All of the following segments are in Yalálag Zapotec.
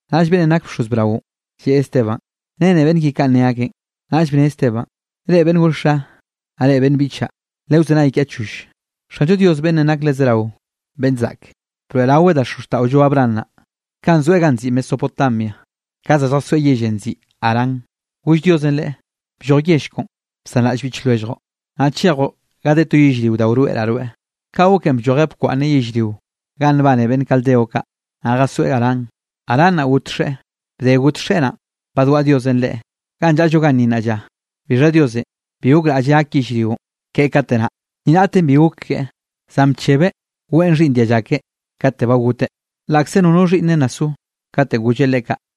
Naꞌll beꞌnnenꞌ nak bxoz braonꞌ, lleꞌe Esteban: —¿Renne beꞌnn ki kanꞌ ne akeꞌn? Naꞌll bne Esteban: —Reꞌ beꞌnn gor xa, naꞌ reꞌ beꞌnn biꞌchaꞌ, le wzenay kiaꞌ choll. Xanllo Dios beꞌnnenꞌ nak le zerao beꞌnn zaꞌk, broeꞌraweꞌ da xozxtaꞌollo Abraham naꞌ, kanꞌ zoeꞌ ganꞌ nziꞌi Mesopotamia, ka za lljasoeꞌ yellenꞌ nziꞌi Harán. Goll Diosenꞌ leꞌe: “Blloj yell koꞌon, bsanraꞌll biꞌch lwelljoꞌ, naꞌ chejoꞌ ga de to yellrio da wroeꞌraꞌ rweꞌ.” Kaꞌ goken bllojeꞌ bkwaꞌnneꞌ yellrio ganꞌ nbane beꞌnn Caldeo kaꞌ, naꞌ jasoeꞌ Harán. Harán naꞌ got xeꞌe. Bde got xeꞌe naꞌn, badwaꞌa Diosenꞌ leꞌe ganꞌ llaꞌllo ganni nnaꞌ lla. Bixha Diosenꞌ bi gokraꞌlleꞌ gak yellrionꞌ keꞌe kate naꞌ, ni raꞌten bi gok keꞌe, zan bchebeꞌ weꞌen xhiꞌnn dialla keꞌe kate ba goteꞌ, laꞌkze nono xhiꞌnneꞌ nna so, katenꞌ golleꞌ leꞌe kaꞌ.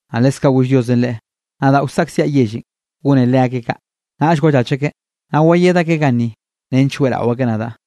Naꞌ leskaꞌ goll Diosenꞌ leꞌe: “Nadaꞌ wsaꞌkziaꞌ yellenꞌ gone leakeꞌ kaꞌ, naꞌll wallach akeꞌ, naꞌ wayed akeꞌ ganni nench weꞌrao akeꞌ nadaꞌ.”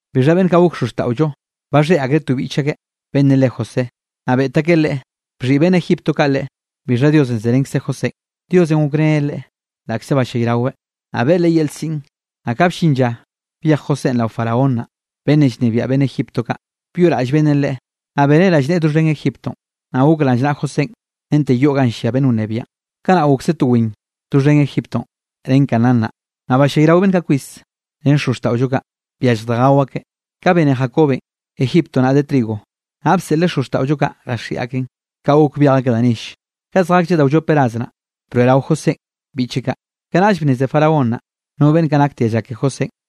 ’Bixha beꞌnn kaꞌ gok xozxtaꞌollo, baxhéꞌ akreꞌ to biꞌch akeꞌ beꞌnnenꞌ le José, naꞌ beꞌt akeꞌ leꞌe, bxhiꞌi beꞌnn Egipto kaꞌ leꞌe, bixha Diosenꞌ zerenkzeꞌ Josénꞌ. Diosenꞌ gokreneꞌ leꞌe laꞌkze ballayraweꞌ, naꞌ beꞌe leꞌe yel siꞌn. Naꞌ ka bllin lla byej Josénꞌ rao Faraón naꞌ, beꞌnnenꞌ llnebiaꞌ beꞌnn Egipto kaꞌ, byoꞌraꞌll beꞌnnenꞌ leꞌe, naꞌ beneꞌ rallneꞌe doxhen Egiptonꞌ. Naꞌ gok rallnaꞌa Josénꞌ rente yoꞌ ganꞌ llia beꞌnn wnebiaꞌn. ’Kanaꞌ gokse to win doxhen Egiptonꞌ ren Canaán naꞌ, naꞌ ballayrao beꞌnn kaꞌ kwis, ren xozxtaꞌollo kaꞌ, byallj da gao akeꞌ. Ka bene Jacobenꞌ, Egipto naꞌ de trigo, naꞌ bseꞌleꞌ xozxtaꞌollo kaꞌ jaxiꞌi akeꞌn, ka gok byej akeꞌ da nelle. Ka zjaklleꞌ da wllop ras naꞌ, broeꞌrao Josénꞌ biꞌche kaꞌ. Kanaꞌll bnneze Faraón naꞌ, no beꞌnn kaꞌ nak dialla Josénꞌ.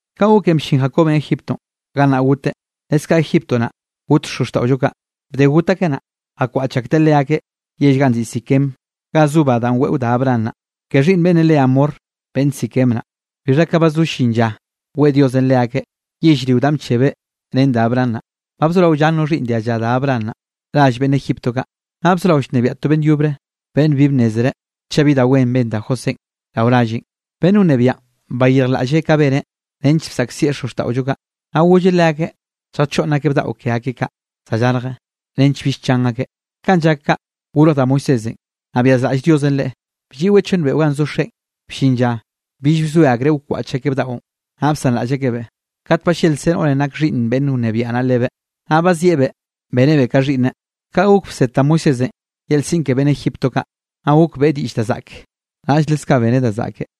Kaꞌ goken bllin Jacobenꞌ Egiptonꞌ, gannaꞌ goteꞌ; leskaꞌ Egipto naꞌ, got xozxtaꞌollo kaꞌ. Bde got akeꞌ naꞌ, jakwaꞌch akteꞌ leakeꞌ yell ganꞌ nziꞌi Siquem ganꞌ zo ba danꞌ weꞌo Abraham naꞌ, ke xhiꞌnn beꞌnnenꞌ le Hamor beꞌnn Siquem naꞌ. ’Bixha ka ba zo llin lla weꞌe Diosenꞌ leakeꞌ yellrio danꞌ bchebeꞌ ren da Abraham naꞌ, ba bzorao llan no xhiꞌnn dialla da Abraham naꞌ, rall beꞌnn Egipto kaꞌ. Naꞌ bzorao llnebiaꞌ to beꞌnn yobre, beꞌnn bi bnnezreꞌ chaꞌ bi da wen ben da Josénꞌ rao ralleꞌn. Beꞌnn wnebiaꞌn bayirjlaꞌlleꞌ ka beneꞌ nench bsaꞌkzieꞌ xozxtaꞌollo kaꞌ, naꞌ golleꞌ leakeꞌ lljachoꞌnn akeꞌ bdaꞌo ke akeꞌ kaꞌ za llarje, nench bill chan akeꞌ. Kanꞌ llak kaꞌ, gorj da Moisésenꞌ, naꞌ byazraꞌll Diosenꞌ leꞌe, blliꞌweꞌ chonn beꞌo ganꞌ zo xeꞌen. Bllin lla bill bzoe akreꞌ wkwaꞌch akeꞌ bdaꞌon, naꞌll bsanraꞌll akebeꞌ. Kat ballelkze noꞌrenꞌ nak xhiꞌnn beꞌnn wnebiaꞌ naꞌ lebeꞌ, naꞌ bazieꞌbeꞌ bénebeꞌ ka xhiꞌnneꞌ. Kaꞌ gok bsed da Moisésenꞌ yel siꞌn ke beꞌnn Egipto kaꞌ, naꞌ gok beꞌe diꞌll da zaꞌke, naꞌll leskaꞌ beneꞌ da zaꞌke.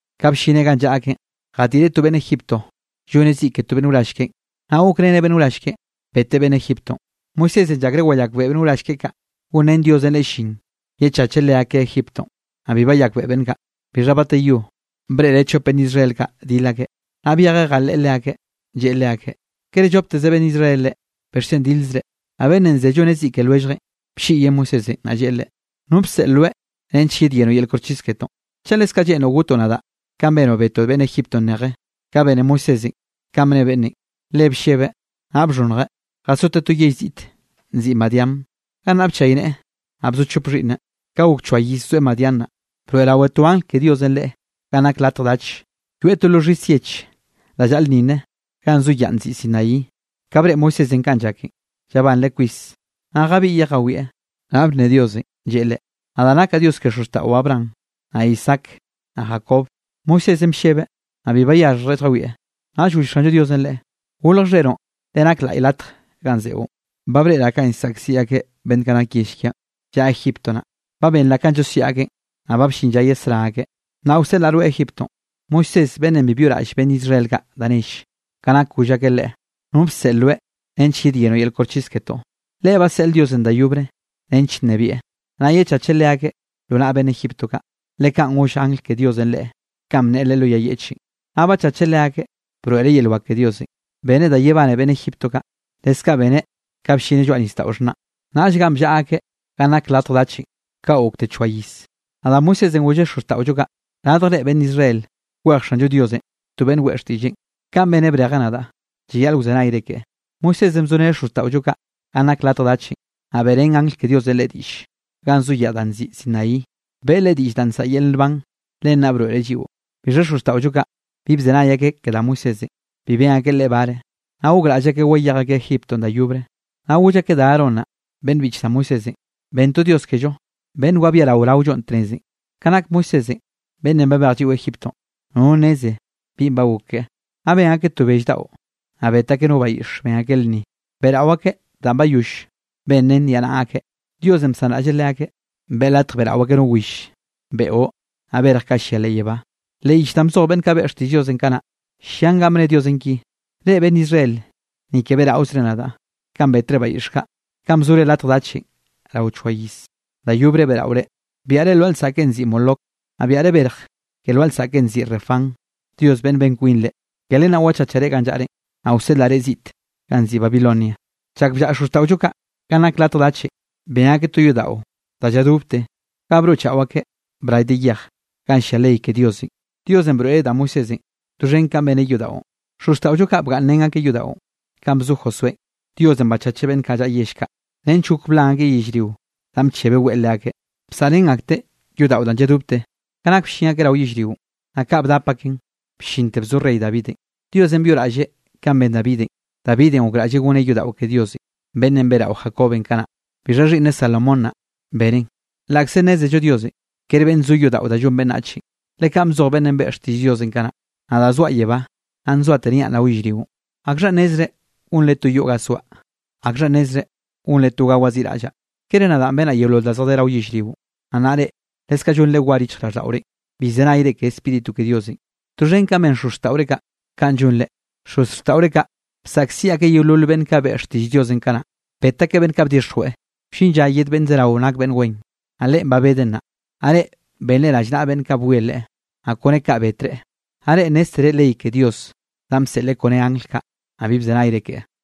Ka bllineꞌ ganꞌ llaꞌa akeꞌn, jadiꞌreꞌ to beꞌnn Egiptonꞌ lloneꞌ ziꞌ ke to beꞌnn wrall keꞌen, naꞌ gokreneꞌ beꞌnn wrall keꞌen, betteꞌ beꞌnn Egiptonꞌ. Moisésenꞌ llakreꞌ wayakbeꞌe beꞌnn wrall keꞌe kaꞌ, gonrén Diosenꞌ leꞌe llin yechacheꞌ leakeꞌ Egiptonꞌ, naꞌ bi bayakbeꞌe beꞌnn kaꞌ. Bixha bateyore breꞌreꞌ chop beꞌnn Israel kaꞌ dil akeꞌ, naꞌ byejeꞌ jaleꞌe leakeꞌ, lleꞌe leakeꞌ: “¿Kere llopteze beꞌnn Israel reꞌ, bixchen dilzre?” Naꞌ beꞌnnenꞌ ze lloneꞌ ziꞌ ke lwelljeꞌn, blliꞌyeꞌ Moisésenꞌ, naꞌ lleꞌe leꞌe: “¿Nonꞌ bseꞌl rweꞌ nench yedyenoꞌ yel koxchis ketoꞌn? ¿Chaꞌ leskaꞌ lleꞌnroꞌ gotoꞌ nadaꞌ kanꞌ benoꞌ betoꞌ beꞌnn Egiptonꞌ neje?” Ka bene Moisésenꞌ kanꞌ bne beꞌnnenꞌ, le bllebeꞌ naꞌ bxhonnjeꞌ, jasoteꞌ to yell ziꞌte nziꞌi Madián. Gannaꞌ bchayneꞌe, naꞌ bzo chop xhiꞌnneꞌ. ’Ka gok choa iz zoeꞌ Madián naꞌ, broeꞌrao to angl ke Diosenꞌ leꞌe ganꞌ nak latj dach, yoeꞌ to lo xhis yeꞌche da llaꞌlnninnen ganꞌ zo yaꞌ nziꞌi Sinaí. Ka breꞌe Moisésenꞌ kanꞌ llaken, llabanreꞌ kwis, naꞌ jabiꞌyeꞌ jawieꞌ, naꞌ bne Diosenꞌ, lleꞌe leꞌe: “Nadaꞌ nakaꞌ Dios ke xozxtaꞌo Abraham, naꞌ Isaac, naꞌ Jacob.” Moisésenꞌ bllebeꞌ, naꞌ bi bayaxhjreꞌ lljawieꞌ. Naꞌll goll Xanllo Diosenꞌ leꞌe: “Golje xheroꞌn le nak laꞌy latj ganꞌ zeꞌon. Ba breꞌraꞌ kanꞌ llsaꞌkziꞌ akeꞌ beꞌnn kaꞌ nak yell kiaꞌn llaꞌa Egipto naꞌ, ba benraꞌ kanꞌ llosiaꞌ akeꞌn, naꞌ ba bllin lla yesrá akeꞌ. Nnaꞌ wseꞌlaꞌ rweꞌ Egiptonꞌ.” ’Moisés, beꞌnnenꞌ bi byoꞌraꞌll beꞌnn Israel kaꞌ da nell, ka nak goll akeꞌ leꞌe: “¿No bseꞌl rweꞌ nench yedyenoꞌ yel koxchis ketoꞌ?” Leꞌe baseꞌl Diosenꞌ da yobre nench nnebieꞌ, naꞌ yechacheꞌ leakeꞌ lo naꞌ beꞌnn Egipto kaꞌ, le kaꞌn goll angl ke Diosenꞌ leꞌe kanꞌ bneꞌe lo yay yeꞌchenꞌ. Naꞌ bachacheꞌ leakeꞌ, broeꞌreꞌ yel wak ke Diosenꞌ, beneꞌ da yebane beꞌnn Egipto kaꞌ, leskaꞌ beneꞌ ka bllineꞌ lloaꞌ Nisdaꞌo Xhnaꞌn, naꞌll ganꞌ bllaꞌa akeꞌ ganꞌ nak latj dachenꞌ, kaꞌ gokte choa iz. Naꞌ da Moisésenꞌ golleꞌ xozxtaꞌollo kaꞌ: “Radjre beꞌnn Israel, kwej Xanllo Diosenꞌ to beꞌnn weꞌe xtiꞌlleꞌn, kanꞌ beneꞌ brejeꞌ nadaꞌ, llayaꞌl wzenayre keꞌe.” Moisésenꞌ bzoreneꞌ xozxtaꞌollo kaꞌ ganꞌ nak latj dachenꞌ, naꞌ beꞌrén angl ke Diosenꞌ leꞌe diꞌll, ganꞌ zo yaꞌ da nziꞌi Sinaí, beꞌe leꞌe diꞌll da nsaꞌa yel nban, len naꞌ broeꞌreꞌ lliꞌo. ’Bixha xozxtaꞌollo kaꞌ, bi bzenay akeꞌ ke da Moisésenꞌ, bi ben akeꞌ leꞌe bare, naꞌ gokraꞌll akeꞌ wayej akeꞌ Egiptonꞌ da yobre. Naꞌ goll akeꞌ da Aarón naꞌ, beꞌnn biꞌch da Moisésenꞌ: “Ben to dios kello, beꞌnn wabiarao raollo tnezenꞌ. Ka nak Moisésenꞌ beꞌnnenꞌ babej lliꞌo Egiptonꞌ, nono nneze binꞌ ba gok keꞌe.” Naꞌ ben akeꞌ to bell daꞌo, naꞌ bet akeꞌ no bayiꞌx, ben akeꞌ lnni, beꞌrao akeꞌ danꞌ bayoll ben ren niaꞌnaꞌa akeꞌn. Diosenꞌ bsanraꞌlleꞌ leakeꞌ, beꞌe latj beꞌrao akeꞌ no will, beꞌo naꞌ berj kaꞌ llia leꞌ yebá. Leꞌ yich danꞌ bzoj beꞌnn kaꞌ beꞌe xtiꞌll Diosenꞌ kanaꞌ naꞌ, llian ganꞌ bne Diosenꞌ ki: Reꞌ beꞌnn Israel, ni ke beꞌraozre nadaꞌ, kanꞌ betre bayiꞌx kaꞌ, kanꞌ bzore latj dachenꞌ rao choa iz. Da yobre beꞌraore, biaꞌre lwaꞌa lsaꞌkenꞌ nziꞌi Moloc, naꞌ biaꞌre berj ke lwaꞌa lsaꞌken nziꞌi Refán dios ben kwinre. Ke len wachachaꞌ reꞌ ganꞌ llaꞌrenꞌ, naꞌ wseꞌlaꞌ reꞌ ziꞌt ganꞌ nziꞌi Babilonia. ’Chak bllaꞌa xozxtaꞌollo kaꞌ ganꞌ nak latj dachenꞌ, ben akeꞌ to yodaꞌo da lladobte ga broꞌchaꞌo akeꞌ bray de yej, ganꞌ llia ley ke Diosenꞌ. Diosenꞌ broeꞌreꞌ da Moisésenꞌ doxhen kanꞌ beneꞌ yodaꞌon. Xozxtaꞌollo kaꞌ bgaꞌnnrén akeꞌ yodaꞌon. Kanꞌ bzo Josuénꞌ, Diosenꞌ bchacheꞌ beꞌnn kaꞌ llaꞌa yell kaꞌ, nench gok blan akeꞌ yellrio danꞌ bchebeꞌ weꞌe leakeꞌ. Bsaꞌrén akteꞌ yodaꞌo danꞌ lladobte, ka nak bllin akeꞌ rao yellrionꞌ, naꞌ kaꞌ bdap akeꞌn bllinte bzo rey Davidenꞌ. Diosenꞌ byoꞌraꞌlleꞌ kanꞌ ben Davidenꞌ, Davidenꞌ gokraꞌlleꞌ goneꞌ yodaꞌo ke Diosenꞌ, beꞌnnenꞌ beꞌrao Jacobenꞌ kanaꞌ. Bixha xhiꞌnneꞌ Salomón naꞌ, beneꞌn. Laꞌkze nnézello Diosenꞌ ker beꞌnn zo yodaꞌo da llon beꞌnnachenꞌ, le kanꞌ bzoj beꞌnnenꞌ beꞌe xtiꞌll Diosenꞌ kanaꞌ: Nadaꞌ zoaꞌ yebá, naꞌ nzoate niaꞌ rao yellrionꞌ. ¿Akxhanꞌ nezre gonre to yoꞌ ga soaꞌ? ¿Akxhanꞌ nezre gonre to ga waziꞌraꞌllaꞌ? ¿Kere nadaꞌ benaꞌ yeolol da zjadé rao yellrionꞌ? ’Naꞌ nnaꞌ reꞌ, leskaꞌ llonre war yichjraꞌlldaꞌorenꞌ, bi llzenayre ke Spíritu ke Diosenꞌ, doxhen kanꞌ ben xozxtaꞌore kaꞌ, kaꞌn llonre. Xozxtaꞌore kaꞌ bsaꞌkziꞌ akeꞌ yeolol beꞌnn kaꞌ beꞌe xtiꞌll Diosenꞌ kanaꞌ. Bet akeꞌ beꞌnn kaꞌ bdixjweꞌ, wllin lla yed beꞌnnenꞌ zerao nak beꞌnn wen. Naꞌ Leꞌen ba bedeꞌ nnaꞌ, naꞌ reꞌ benreꞌ rallnaꞌa beꞌnn kaꞌ bwie Leꞌe, naꞌ kone kaꞌ betreꞌ. Naꞌ reꞌ nnéztere ley ke Dios danꞌ bseꞌleꞌ kone angl kaꞌ, naꞌ bi bzenayre ke.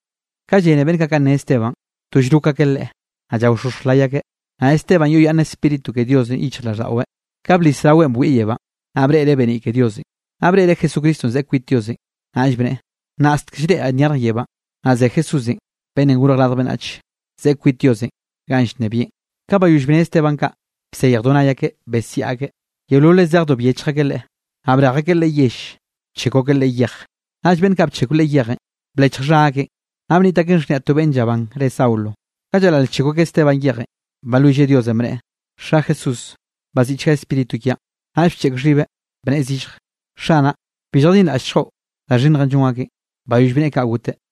Ka llene beꞌnn kaꞌ kanꞌ ne Esteban, to llrok akeꞌ leꞌe, naꞌ llaoxoxj lay akeꞌ. Naꞌ Esteban yoꞌyaꞌnn Spíritu ke Diosenꞌ yichjraꞌlldaꞌweꞌ, ka blis raweꞌn bwieꞌ yebánꞌ, naꞌ breꞌreꞌ beniꞌ ke Diosenꞌ, naꞌ breꞌreꞌ Jesucristonꞌ zeꞌe kwit Diosenꞌ. Naꞌll bneꞌe: —Nnaꞌstek llreꞌraꞌ nyarj yebánꞌ, naꞌ ze Jesúsenꞌ Beꞌnnenꞌ Gorj Radj Beꞌnnach, zeꞌe kwit Diosenꞌ ganꞌ llnebieꞌn. Ka bayoll bne Esteban kaꞌ, bsejdo nay akeꞌ besiaꞌ akeꞌ, yeololeꞌ zejdo, byechj akeꞌ leꞌe. Naꞌ brej akeꞌ leꞌe yell, bchekw akeꞌ leꞌe yej. Naꞌll beꞌnn kaꞌ bchekw leꞌe yejenꞌ, blechj xha akeꞌn, naꞌ bniꞌt akeꞌn xhniaꞌ to beꞌnn llabán re Saulo. Ka llaral llchekw akeꞌ Esteban yejenꞌ, balwilleꞌ Diosenꞌ bneꞌe: —Xa Jesús, baziꞌchga spíritu kiaꞌn. Naꞌll bcheꞌk xhibeꞌ, bneꞌe zillj: —Xanaꞌ, bi lljadinraꞌllchgoꞌ da xhinnjenꞌ llon akeꞌn. Bayoll bneꞌe kaꞌ goteꞌ.